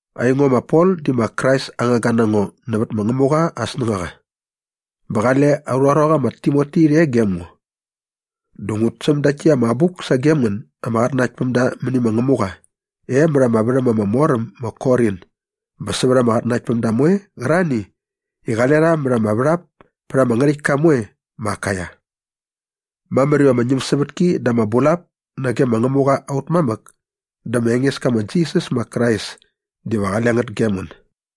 Aingo ma Pol di ma Krais aa ngangga na ngo nävät ma Ngämuqa aa snängaqa. Bä qale aurha ruaqa ma Timoti rhe gem ngo. Dä ngut säm dakt täkt ama abuk sagem ngän ama qatnanaktpämda mäni ma Ngämuqa e mät ama värhäm ama mor äm ma Korin bä sävät ama qatnanaktpämda moe qärarhani i qale rha mät ama värhap pät ama ngärhäktka moe ma Akaia. Mamär iva ama ñämsävätki dä ama bulap sagem ngän nage ma Ngämuqa aut mamäk dä ma Engeska ma Jisas ma Krais diva qale ngät gem ngän.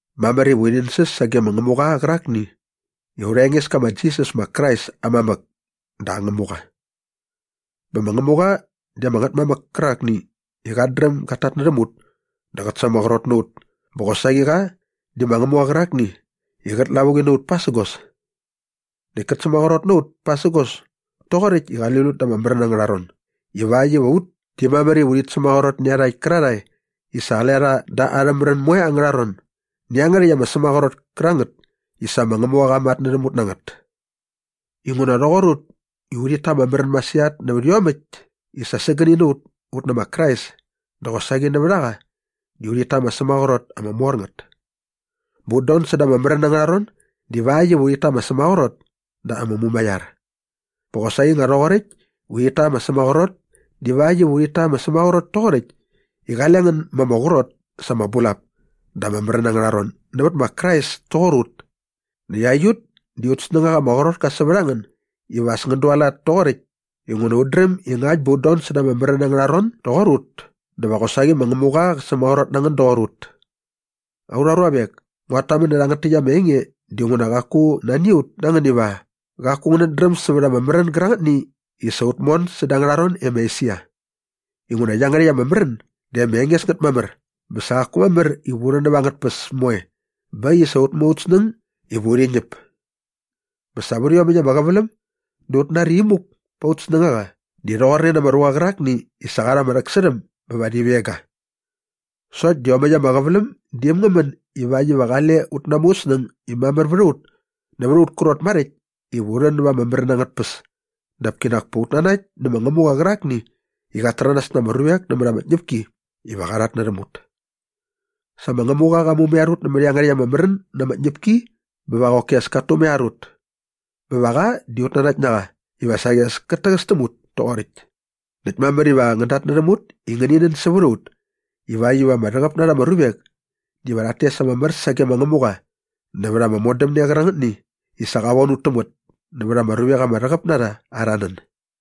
Mamär iva urhi nänsäs sage ma Ngämuqa qärakni i aurha Engeska ma Jisas ma Krais aa mamäk dä aa Ngämuqa. Bä ma Ngämuqa di ama Ngätmamäk kärakni i qat dräm gat tatnärhäm ut dä qät sämaqrot na ut bä qosaqi qa di ma Ngämuqa qärakni i qät lavuqi na ut pasägos. Näkt kät sämaqrot na ut pasägos toqoräkt i qali lut da ama märän angärha ron ivakt iva ut di mamär iva urhit sämaqrot nä iarhakt kärarhae i sa qale rha da arhä märän moe angärha ron nä iangärhäkt ama sämaqrot kärangät i sa ma Ngämuqa qa matnärhäm ut na ngät. Inguna rhoqor ut i urhit ta ama märän masirhat nävät iomäkt i sa sägäni na ut ut nä ma Krais dä qosaqi nävät a qa di urhit ta ama sämaqrot ama mor ngät. Bä ut don säda ama märän angärha ron divakt iva ngänit ta ama sämaqrot dä ama mumaiar. Bä qosaqi nga rhoqoräkt i ut ta ama sämaqrot divakt iva ngänit ta ama sämaqrot toqoräkt i qale ngän ma ama qrot sa ama bulap da ama märän angärha ron nävät ma Krais toqor ut. Näkt aiut di aut snängaqa ama qrot ka sävät a ngän iva as ngän dualat toqoräkt inguna ut dräm i ngakt bä ngän don säda ama märän angärha ron doqor ut dä va qosaqi ma Ngämuqa qä sämaqrot na ngän doqor ut. Aurha ruavek, nguat tamän nä rhangät täkt ama enge dinguna qaku nani a ut na ngän iva qaku ngänät dräm sävät ama märän gärangätni i sa ut mon säda angärha ron e ma Esia. Inguna iangärhäkt ama märän di ama enges ngät mamär bä sa qaku mamär iva u rhän näva angät tpäs moe bä äkt i sa ut mu aut snäng iva urhi ñäp. Bä sa vät iomäkt ama qäväläm dä ut nari imuk pät aut snängaqa di rhoqorne na ama ruqa qärakni i sa qa rha ama rhäksärhäm bä va rhi veng ga. Sokt di iomäkt ama qäväläm di äm ngä män ivakt iva qale ut namu ut snäng i mamär vät a ut nävät aut krot maräkt iva u rhän näva ama märän angät tpäs dap kinak pa ut nanakt nä ma Ngämuqa qärakni i qat täranas na ama ruvek nämät ama tñäpki iva qa rhatnärhäm ut. Sa ma Ngämuqa qa mumaiar ut nämät iangärhäkt ama märän na ama tñäpki bä va qoki as kat tumaiar ut. Bä va qa di ut nanakt na qa iva saqi as kat täqäs täm ut toqoräkt. Näkt mamär iva ngän datnärhäm ut i ngäni nän sävät a ut ivakt iva ama rhäqäp na rha ama ruvek diva rhat tes ama mär sage ma Ngämuqa nävät ama modämne qärangätni i sa qa von ut täm ngät nävät ama ruvek ama rhäqäp na rha arha nän.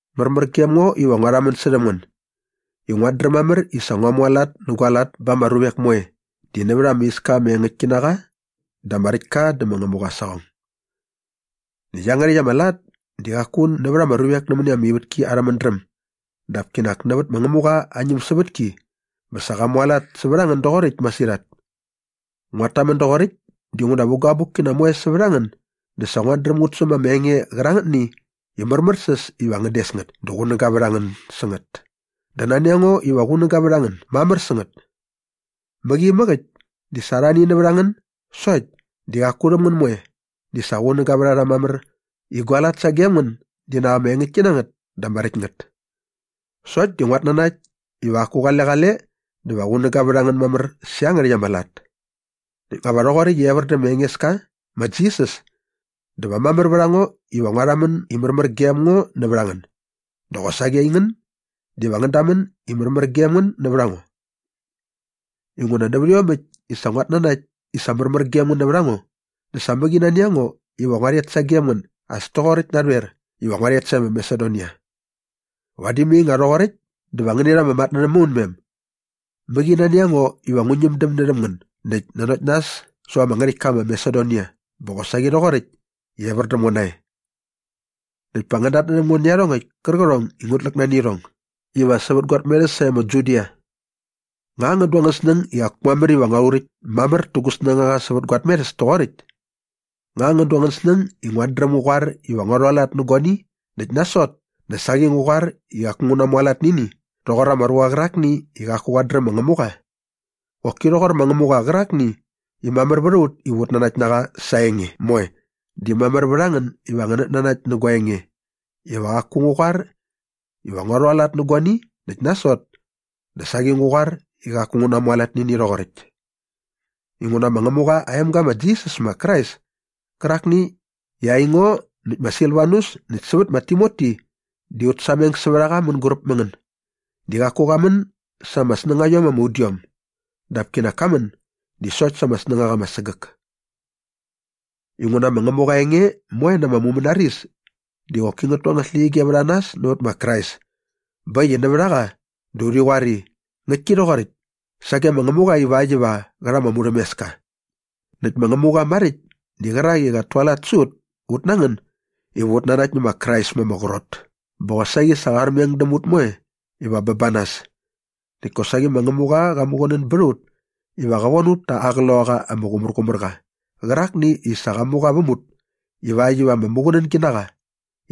Märmär gem ngo iva ngua rhamän särhäm ngän i nguat dräm mamär i sa ngua mualat nä gua lat ba ama ruvek moe di nävät ama iska ama engäktki na qa dä ama räkt ka dä ma Ngämuqa aa saqong. Näkt iangärhäkt ama lat di qaku nävät ama ruvek nämäni ama ivätki arhä mädräm dap kinak nävät ma Ngämuqa aa ñämsävätki bä sa ngua mualat sävät a ngän doqoräkt masirhat. Nguat tamän doqoräkt dinguna vä gua abukkina moe sävät a ngän dä sa nguat dräm ngut säm ama enge qärangätni i märmärsäs iva ngän des ngät dä qunäga vät a ngän sä ngät dä nani a ngo iva qunäga vät a ngän mamär sä ngät. Mäqi inamäk äkt di sa arhani nävät a ngän sokt di qaku rhäm ngän moe di sa qunäga vät a rha mamär i gua lat sagem ngän di nak ama engäktki na ngät dä ama räkt ngät. Sokt di nguat nanakt iva qaku qale qale dä va qunäga vät a ngän mamär sä iangärhäkt ama lat. Näkt nga va rhoqoräkt i evär dä ma Engeska ma Jisas dä va mamär vät a ngo iva ngua rhamän i märmär gem ngo nävät a ngän dä qosaqi aingän diva ngän dämän i märmär gem ngän nävät a ngo. Inguna nävät iomäkt i sa nguat nanakt i sa märmär gem ngän nävät a ngo dä sa mäqi nani a ngo iva ngua rhet sagem ngän as toqoräkt narhoer iva nguat tet sae ma Masedonia. Vadi mai nga rhoqoräkt dä va ngäni rha ama matnärhäm maunmem. Mäqi nani a ngo iva ngu ñämdäm närhäm ngän näkt nanokt nas säva ama ngärhäktka ma Masedonia bä qosaqi rhoqoräkt i evär däm ngo nae. Näkt pa ngän datnärhäm ngo nä iarhongäkt kärqärhong i ngut läk nani irhong iva sävät gua tmerhäs sae ma Judia. Nga ngän du angän snäng i qaku mamär iva ngua rhuräkt mamär tä gu snängaqa sävät gua tmerhäs toqoräkt? Nga ngän du angän snäng i nguat dräm ngu qoar iva ngua rhualat nä guani näkt nasot dä saqi ngu qoar i qaku ngu namualat nä ini rhoqor ama ruqa qärakni i qaku qat dräm ma Ngämuqa? Qoki rhoqor ma Ngämuqa qärakni i mamär vät a ut iva ut nanakt na qa sa aa enge moe di mamär vät a ngän iva ngänät nanakt nä gua enge iva qaku ngu qoar iva ngua rhualat nä guani näkt nasot dä saqi ngu qoar i qaku ngu namualat nä ini rhoqoräkt. Inguna ma Ngämuqa aa emga ma Jisas ma Krais kärakni i aingo näkt ma Silvanus näkt sävät ma Timoti di ut sameng sävät a qa mänguräp mä ngän di qaku qa män sa ama snängaiom ama udiom dap kinak ka män di sokt sa ama snängaqa ama sägäk. Inguna ma Ngämuqa aa enge moe na ama mumänaris di qoki ngät tu angät släqyige vät a nas nävät ma Krais bä äkt i nävät a qa dä urhi qoar i, “Ngäktki rhoqoräkt” sage ma Ngämuqa ivakt iva qä rha ama murhämeska. Näkt ma Ngämuqa maräkt di qärak i qat tualat sä ut ut na ngän iva ut nanakt nä ma Krais ma ama qrot bä qosaqi sa qa armeng däm ut moe iva bä ba nas. Näkt kosaqi ma Ngämuqa qa muqunän bät a ut i qa von ut ta aa Qloqaqa ama Qumärqumärqa qärakni i sa qa mu qa väm ut ivakt iva ama muqunängi na qa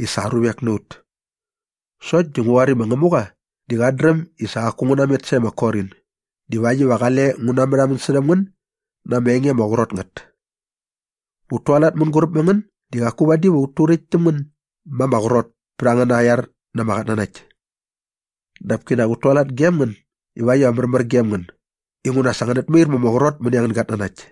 i sa aa ruvek na ut. Sokt di ngu qoar i ma Ngämuqa di qat dräm i sa qaku ngu namet sae ma Korin divakt iva qale ngu namärhamän särhäm ngän na ama enge ama qrot ngät. Ut tualat mänguräp mä ngän di qaku vadi va ut turäkt täm ngän ma ama qrot pät angäna iar na ama qatnanakt. Dap kinak ut tualat gem ngän ivakt iva märmär gem ngän inguna sa ngänät mair ma ama qrot mäni angän gatnanakt.